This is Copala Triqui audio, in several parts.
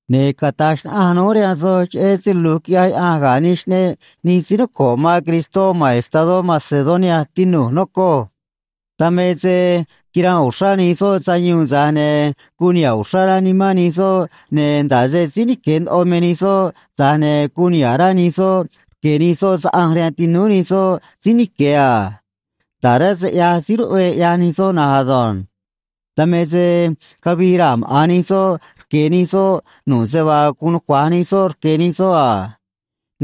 Ne̱ cata̱j xnaꞌanj núj rihaan soj cheꞌé se lu̱j quiꞌyaj Yaꞌanj ga̱ nij xꞌneꞌ nij síí noco̱ꞌ man Cristó ma̱n estadó Macedonia, tinu̱j, nocoj. Dan me se quiranꞌ uxrá nij soꞌ sayuun, tza̱j ne̱ guun niha̱ꞌ uxrá rá nimán nij soꞌ, ne̱ nda̱ꞌ se síí nique̱ ndoꞌo me nij soꞌ, tza̱j ne̱ guun niha̱ꞌ rá nij soꞌ rque̱ nij soꞌ saꞌanj rihaan tinúú nij soꞌ síí nique̱ a. Nda̱ꞌ rá se ꞌyaj síí ruꞌvee ꞌyaj nij soꞌ na̱nj ado̱nj. Dan me se cavii raa̱ maꞌa̱n nij soꞌ rque̱ nij soꞌ nu̱ꞌ se vaa guun nucua̱j nij soꞌ rque̱ nij soꞌ a.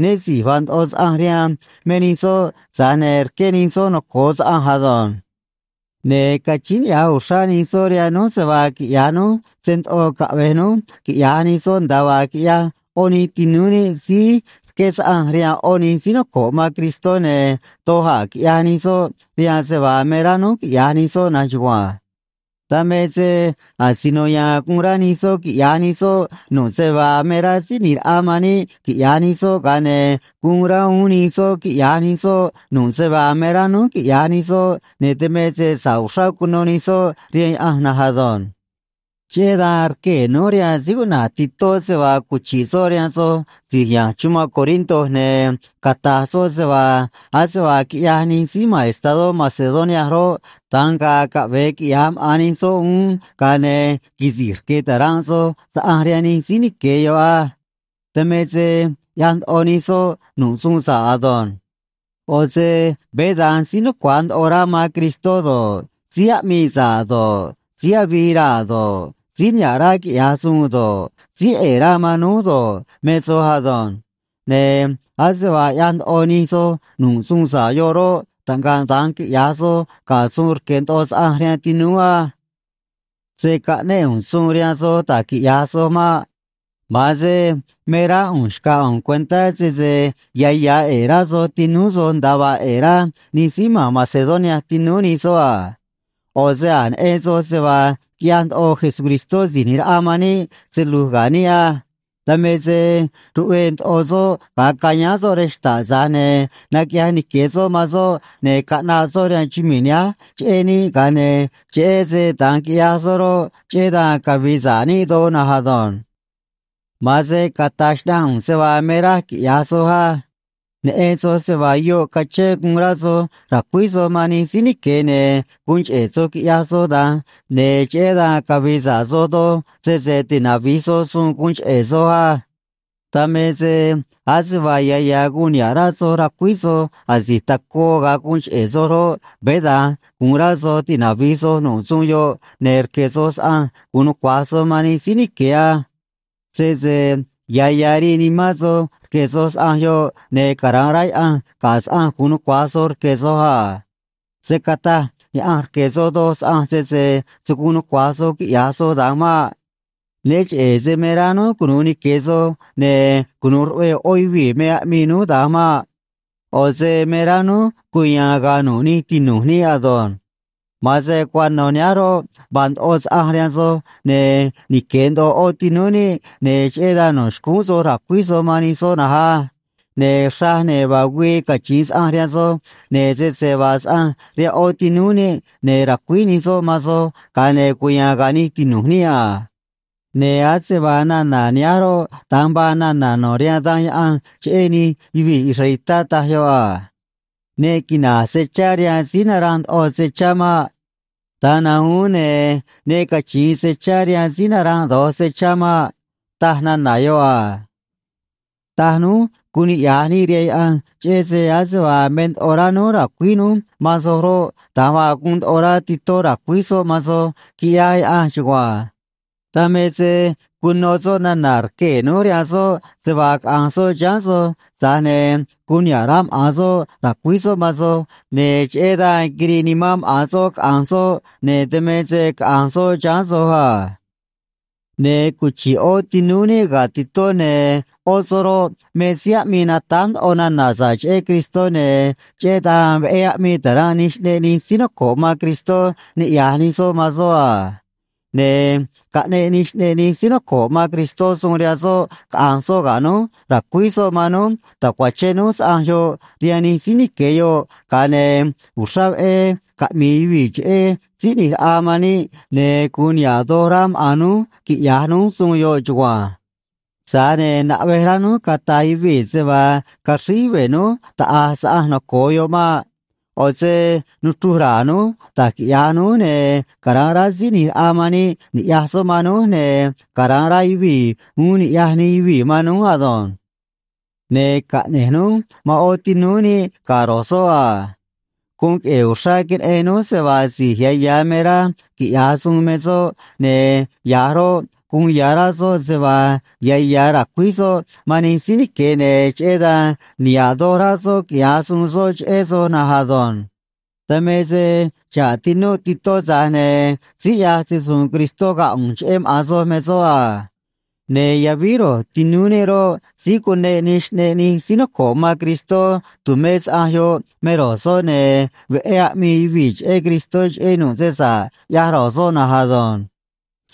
Né si̱j vaa ndoꞌo saꞌanj rihaan me nij soꞌ, tza̱j ne̱ rqué nij soꞌ noco̱o saꞌanj ado̱nj. Ne̱ cachíín niꞌya̱j uxrá nij soꞌ rihaan núj se vaa quiꞌya̱j núj se ndoꞌo caꞌve̱j núj quiꞌya̱j nij soꞌ nda̱a vaa quiꞌyaj ꞌó nij tinúú níꞌ síí rqué saꞌanj rihaan ꞌó nij síí noco̱ꞌ man Cristó, ne̱ doj a̱ quiꞌyaj nij soꞌ rihaan se vaa me rá núj quiꞌya̱j nij soꞌ na̱nj chugua̱nj. Dan me se asino ya̱a̱n guun rá nij soꞌ quiꞌya̱j nij soꞌ nu̱ꞌ se vaa me rá Síí ꞌNi̱j Raꞌa man níꞌ quiꞌya̱j nij soꞌ, ga̱a ne̱ guun rá uún nij soꞌ quiꞌya̱j nij soꞌ nu̱ꞌ se vaa me rá núj quiꞌya̱j nij soꞌ, ne̱ dan me se sa̱ꞌ uxrá cuno nij soꞌ rihaan Yaꞌanj na̱nj ado̱nj. Cheꞌé dan rquee̱ núj rihaan síí cuꞌna̱j Titó se vaa cuchi̱ꞌ soꞌ rihaan soj si̱j ya̱nj chumanꞌ Corinto, ne̱ cata̱j soꞌ se vaa ase vaa quiꞌyaj nij síí ma̱n estadó Macedonia roꞌ, da̱nj ga̱a̱ caꞌve̱e quiꞌya̱j maꞌa̱n nij soj uún, ga̱a ne̱ quisi̱j rqué ta̱ranꞌ soj saꞌanj rihaan nij síí nique̱ yoꞌ á. Dan me se ꞌyaj ndoꞌo nij soj nu̱ꞌ suun sa̱ꞌ ado̱nj. ꞌO̱ se veé da̱nj síí nucua̱j ndoꞌo rá man Cristó do̱ꞌ, síí aꞌmii sa̱ꞌ do̱ꞌ, síí avii raa̱ do̱ꞌ, síí niha̱ꞌ rá quiꞌya̱j suun do̱ꞌ, síí ꞌe̱e̱ rá man núj do̱ꞌ, me soj ado̱nj. Ne̱ ase vaa ꞌyaj ndoꞌo nij soj nu̱ꞌ suun sa̱ꞌ yoꞌ roꞌ, taꞌngaꞌ da̱nj quiꞌya̱j soj ga̱ suun rque̱ ndoꞌo saꞌanj rihaan tinúú á. Se̱ caꞌnéꞌ ꞌu̱nj suun rihaan soj da̱j quiꞌya̱j soj maꞌ. Ma̱an se me rá ꞌu̱nj xca̱j ꞌu̱nj cuentá sese ya̱ ya̱ ꞌe̱e̱ rá soj tinúú soj nda̱a vaa ꞌe̱e̱ rá nij síí ma̱n Macedonia tinúú nij soꞌ a. ꞌO̱ se a̱j neꞌen soj se vaa quiꞌyaj ndoꞌo Jesucristó Si̱j ꞌNi̱j Raꞌa man níꞌ se lu̱j ga̱ níꞌ á. Dan me se ruꞌve̱e̱ ndoꞌo soꞌ ga̱a cayáán soꞌ rej xta̱ꞌ, tza̱j ne̱ naquiꞌyaj nique̱ soꞌ man soꞌ ne̱ caꞌnaꞌ soꞌ rihaan chumii̱ nihánj cheꞌé níꞌ, ga̱a ne̱ cheꞌé se da̱nj quiꞌyaj soꞌ roꞌ, cheꞌé dan cavi̱i̱ sa̱ꞌ níꞌ doj na̱nj ado̱nj. Ma̱an se cata̱j xnaꞌanj ꞌu̱nj se vaa me raj quiꞌya̱j soj á. Neꞌen soj se vaa yoꞌ cachén guun rá soj ra̱cuíj soj man nij síí nique̱, ne̱ guun cheꞌe̱ soj quiꞌyaj soj da̱nj, ne̱ cheꞌé dan cavi̱i̱ sa̱ꞌ soj doj, sese tinavi̱j soj suun guun cheꞌe̱ soj á. Dan me se ase vaa ya̱ ya̱ guun niha̱ꞌ rá soj ra̱cuíj soj asi̱j tacoo ga̱a guun cheꞌe̱ soj roꞌ, veé da̱nj gu̱un rá soj tinavi̱j soj nu̱ꞌ suun yoꞌ, ne̱ rque̱ soj saꞌanj gu̱un nucua̱j soj man nij síí nique̱ á. Sese ya̱ ya̱ rii nimán soj rque̱ soj saꞌanj yoꞌ, ne̱ cara̱nꞌ rá Yaꞌanj ga̱ saꞌanj gu̱un nucua̱j soj rque̱ soj a. Se̱ cataj Yaꞌanj rque̱ soj doj saꞌanj, sese se̱ guun nucua̱j soj quiꞌya̱j soj da̱nj maꞌ. Né cheꞌe̱ se me rá núj cunu̱u nique̱ soj ne̱ cunu̱u ruꞌve̱e̱ ꞌó yuvii̱ me aꞌmii núj da̱nj maꞌ. ꞌO̱ se me rá núj cuya̱a̱n ga̱a̱ nu̱ꞌ nij tinu̱j níꞌ ado̱nj. Ma̱an se cuano̱ nihánj roꞌ, vaa ndoꞌo saꞌanj rihaan soj, ne̱ nique̱ ndoꞌo ꞌó tinúú níꞌ, ne̱ cheꞌé dan no̱ xcúún soj ra̱cuíj soj man nij soꞌ na̱nj á. Ne̱ xraj, ne̱ vaa güii cachi̱in saꞌanj rihaan soj, ne̱ sese vaa saꞌanj rihaan ꞌó tinúú níꞌ, ne̱ ra̱cuíj nij soꞌ man soj, ga̱a ne̱ cuya̱a̱n ga̱a̱ nij tinu̱j níꞌ a. Ne̱ ase vaa nana̱ nihánj roꞌ, da̱nj vaa nana̱ no̱ rihaan Danj Yaꞌanj cheꞌé nij yuvii̱ israelitá, taj yoꞌ a: “Ne quina̱j se chá rihaan síí naranꞌ ndoꞌo se chá maꞌ. Da̱nj na̱nj uún, ne̱ ne cachi̱in se chá rihaan síí naranꞌ do̱j se chá maꞌ”, taj nana̱ yoꞌ a. Taj núj guun niꞌya̱j níꞌ rihaan Yaꞌanj, cheꞌé se ase vaa me ndoꞌo rá núj ra̱cuíj núj man soj roꞌ, da̱nj vaa guun ndoꞌo rá Titó ra̱cuíj soꞌ man soj, quiꞌyaj Yaꞌanj chugua̱nj. Dan me se cuno soꞌ nana̱ rquee̱ núj rihaan soꞌ se vaa caꞌa̱nj soꞌ chiháán soj, tza̱j ne̱ guun niha̱ꞌ rá maꞌa̱n soꞌ ra̱cuíj soꞌ man soj, ne̱ cheꞌé dan quirii nimán maꞌa̱n soꞌ caꞌa̱nj soꞌ, ne̱ dan me se caꞌa̱nj soꞌ chiháán soj a. Ne̱ cuchi̱ꞌ ꞌó tinúú níꞌ ga̱ Titó, ne̱ ꞌó soꞌ roꞌ, me síí aꞌmii natáj ndoꞌo nana̱ sa̱ꞌ cheꞌé Cristó, ne̱ cheꞌé dan veꞌé aꞌmii ta̱ranꞌ nij xꞌneꞌ nij síí noco̱ꞌ man Cristó niꞌya̱j nij soꞌ man soꞌ a. Ne̱ caꞌneꞌ nij xꞌneꞌ nij síí noco̱ꞌ man Cristó suun rihaan soꞌ caꞌa̱nj soꞌ ga̱ núj ra̱cuíj soꞌ man núj ta̱cuachén núj saꞌanj yoꞌ rihaan nij síí nique̱ yoꞌ, ga̱a ne̱ uxrá veꞌé caꞌmi̱i̱ yuvii̱ cheꞌé Síí ꞌNi̱j Raꞌa man níꞌ, ne̱ gu̱un niha̱ꞌ doj rá maꞌa̱n núj quiꞌya̱j núj suun yoꞌ chugua̱nj. Tza̱j ne̱ naꞌvej rá núj cata̱j yuvii̱ se vaa caxríj yuve̱ núj taꞌa̱j saꞌanj noco̱o yoꞌ maꞌ. ꞌO̱ se nuchruj ra̱a̱ núj da̱j quiꞌya̱j núj ne̱ cara̱nꞌ rá Síí ꞌNi̱j Raꞌa man níꞌ ni̱ꞌyaj soꞌ man núj, ne̱ cara̱nꞌ rá yuvii̱ uún ni̱ꞌyaj nij yuvii̱ man núj ado̱nj. Ne̱ caꞌne̱j núj man ꞌó tinúú níꞌ ga̱ ro̱j soꞌ a. Guun queꞌe̱e̱ uxrá queneꞌen núj se vaa si̱j ya̱ ya̱ me rá quiꞌya̱j suun me soꞌ, ne̱ ya̱j roꞌ, guun ya̱ rá soꞌ se vaa ya̱ ya̱ ra̱cuíj soj man nij síí nique̱, ne̱ cheꞌé dan niha̱ꞌ doj rá soꞌ quiꞌya̱j suun soꞌ cheꞌé soj na̱nj ado̱nj. Dan me se xa̱ꞌ tinúꞌ Titó, tza̱j ne̱ síí ꞌyaj se‑su̱u̱n Cristó ga̱ ꞌu̱nj cheꞌé maꞌa̱n soj me soꞌ a. Ne̱ yavíj ro̱j tinúú níꞌ roꞌ, síí cuneꞌ nij xꞌneꞌ nij síí noco̱ꞌ man Cristó tu̱mé saꞌanj yoꞌ me ro̱j soꞌ, ne̱ veꞌé aꞌmii yuvii̱ cheꞌé Cristó, cheꞌé nu̱ꞌ se sa̱ꞌ ꞌyaj ro̱j soꞌ na̱nj ado̱nj.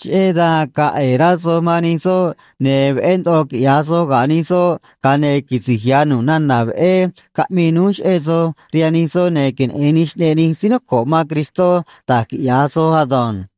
Cheꞌé dan ga̱a̱ ꞌe̱e̱ rá soj man nij soꞌ, ne̱ veꞌé ndoꞌo quiꞌya̱j soj ga̱ nij soꞌ, ga̱a ne̱ quisi̱j ya̱ nu̱ꞌ nana̱ veꞌé caꞌmii núj cheꞌé soj rihaan nij soꞌ, ne̱ queneꞌe̱n nij xꞌneꞌ nij síí noco̱ꞌ man Cristó da̱j quiꞌya̱j soj ado̱nj.